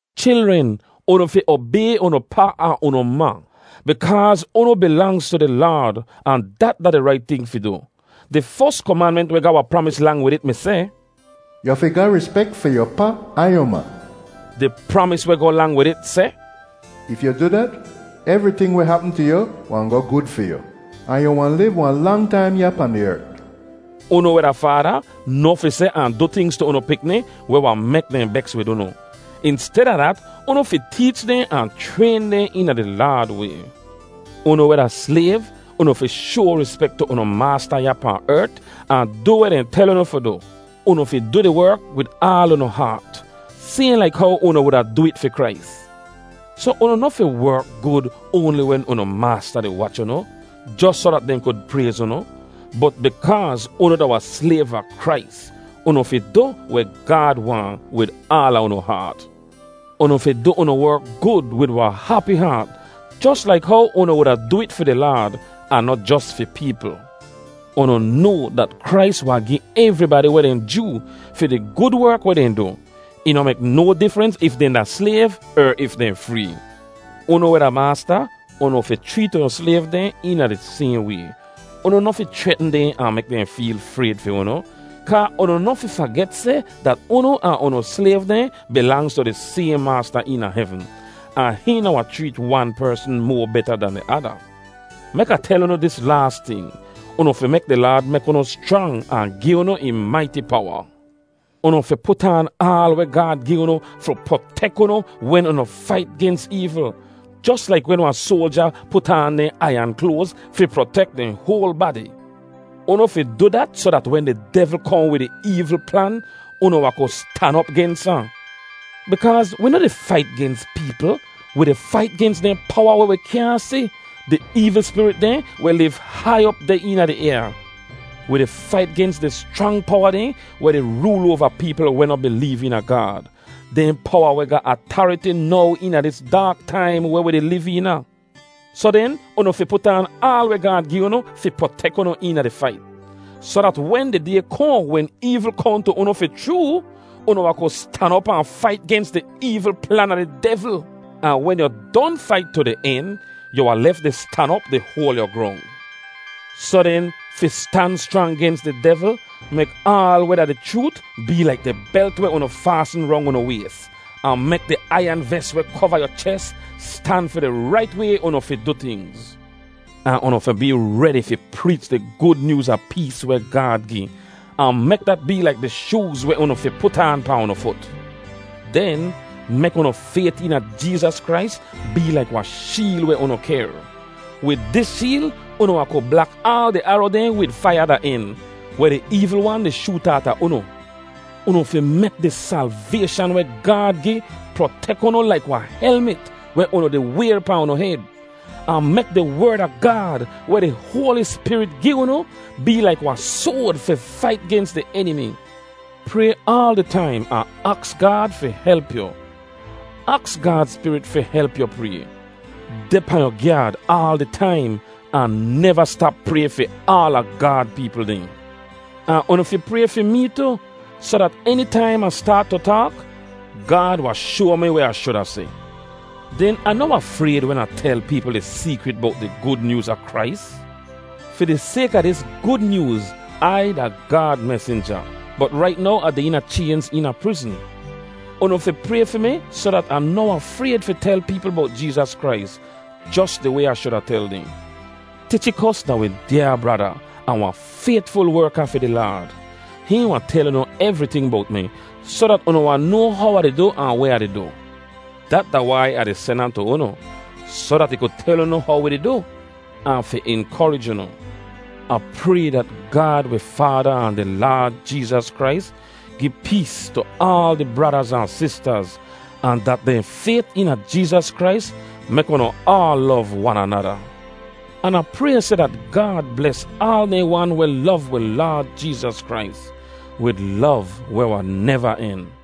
Chilren, unu fi obay unu pa ahn unu ma, bikaaz unu bilangz tu di Laad, ahn dat da di rait ting fi du. Di fos komanment weh ga wahn pramis lang wid it mi seh, “Yu fi ga rispek fi yu pa ahn yu ma.” Di pramis weh goh lang wid it seh, “If yu du dat, evriting weh hapm tu yu wahn goh gud fi yu, ahn yu wahn liv wahn lang taim ya pahn di ert.” Unu weh da faada, noh fi seh ahn du tingz tu unu pikni weh wahn mek dehn beks wid unu. Insteda dat, unu fi teech dehn ahn chrayn dehn eena di Laad way. Unu weh da slayv, unu fi shoa rispek tu unu maasta ya pahn ert ahn du weh dehn tel unu fi du. Unu fi du di werk wid aal unu haat sayhn laik how unu wuda du it fi Krais. Soh unu noh fi werk gud oanli wen unu maasta di wach unu, jos soh dat dehn kud prayz unu. Bot bikaaz unu da wahn slayv a Krais, unu fi du weh Gaad waahn wid aala unu haat. Unu fi du unu werk gud wid wahn hapi haat, jos laik how unu wuda du it fi di Laad, ahn noh jos fi peepl. Unu noa dat Krais wahn gi evribadi weh dehn joo fi di gud werk weh dehn du. Ih noh mek no difrens if dehn da slayv er if dehn free. Unu weh da maasta, unu fi chreet unu slayv dehn eena di sayhn way. Unu noh fi chretn dehn ahn mek dehn feel frayd fi unu, kaa unu noh fi faget seh dat unu ahn unu slayv dehn bilangz tu di sayhn Maasta eena hevn. Ahn hihn noh wahn chreet wan persn moa beta dan di ada. Mek Ah tel unu dis laas ting. Unu fi mek di Laad mek unu schrang ahn gi unu ih maiti powa. Unu fi put aan aal weh Gaad gi unu fi protek unu wen unu fait gens eevl, jos laik wen wahn soalja put aan dehn aiyan kloaz fi protek dehn hoal badi. Unu fi du dat soh dat wen di devl kohn wid ih eevl plan, unu wahn ku stan op gens ahn. Bikaaz wi noh di fait gens peepl. Wi di fait gens dehn powa weh wi kyaahn si, di eevl spirit dehn weh liv hai op deh eena di ayaa. Wi di fait gens di schrang powa dehn weh di rool oava peepl weh noh bileev eena Gaad, dehn powa weh ga atariti now eena dis daak taim weh wi di liv eena. Soh den, unu fi put aan aal weh Gaad gi unu fi protek unu eena di fait, soh dat wen di day kohn wen eevl kohn tu unu fi chroo, unu wahn ku stan op ahn fait gens di eevl plan a di devl. Ahn wen yu don fait tu di en, yu wahn lef di stan op di hoal yu grong. Soh den, fi stan schrang gens di devl, mek aal weh da di chroot bee laik di belt weh unu faasn rong unu ways. Ahn mek di aiyan ves weh kova yu ches stan fi di rait way unu fi du tingz. Ahn unu fi bee redi fi preech di Gud Nyooz a pees weh Gaad gi, ahn mek dat bee laik di shooz weh unu fi put aan pahn unu fut. Den, mek unu fayt eena Jeezas Krais bee laik wahn sheel weh unu kehr. Wid dis sheel unu wahn kud blak aal di aro dehn wid faiya da en, weh di eevl wan di shoot aata unu. Unu fi mek di salvayshan weh Gaad gi protek unu laik wahn helmit weh unu di wayr pahn unu hed. Ahn mek di Werd a Gaad, weh di Hoali Spirit gi unu, bee laik wahn soad fi fait gens di enimi. Pray aal di taim ahn aks Gaad fi help yu. Aks Gaad Spirit fi help yu pray. Deh pahn yu gyaad aal di taim ahn neva stap pray fi aala Gaad peepl dehn. Ahn unu fi pray fi mee tu, soh dat enitaim Ah staat tu taak, Gaad wahn shoa mi weh Ah shuda seh. Den Ah noh wahn frayd wen Ah tel peepl di seekrit bowt di Gud Nyooz a Krais. Fi di sayk a dis Gud Nyooz, Ai da Gaad mesinja, bot rait now Ah deh eena chaynz eena prizn. Unu fi pray fi mi soh dat Ah noh wahn frayd fi tel peepl bowt Jeezas Krais, jos di way Ah shuda tel dehn. Tichikos da wi dyaa brada, ahn wahn faytful werka fi di Laad. Hihn wahn tel unu evriting bowt mi, soh dat unu wahn noa how Ah di du ahn weh Ah di du. Dat da wai Ah di sen ahn tu unu, soh dat ih ku tel unu how wi di du, ahn fi inkorij unu. Ah pray dat Gaad wi Faada ahn di Laad Jeezas Krais gi pees tu aal di bradaz ahn sistaz, ahn dat dehn fayt eena Jeezas Krais mek unu aal lov wan anada. An Ah pray seh dat Gaad bles aal dehn wan weh lov wi Laad Jeezas Krais, wid lov weh wahn neva en.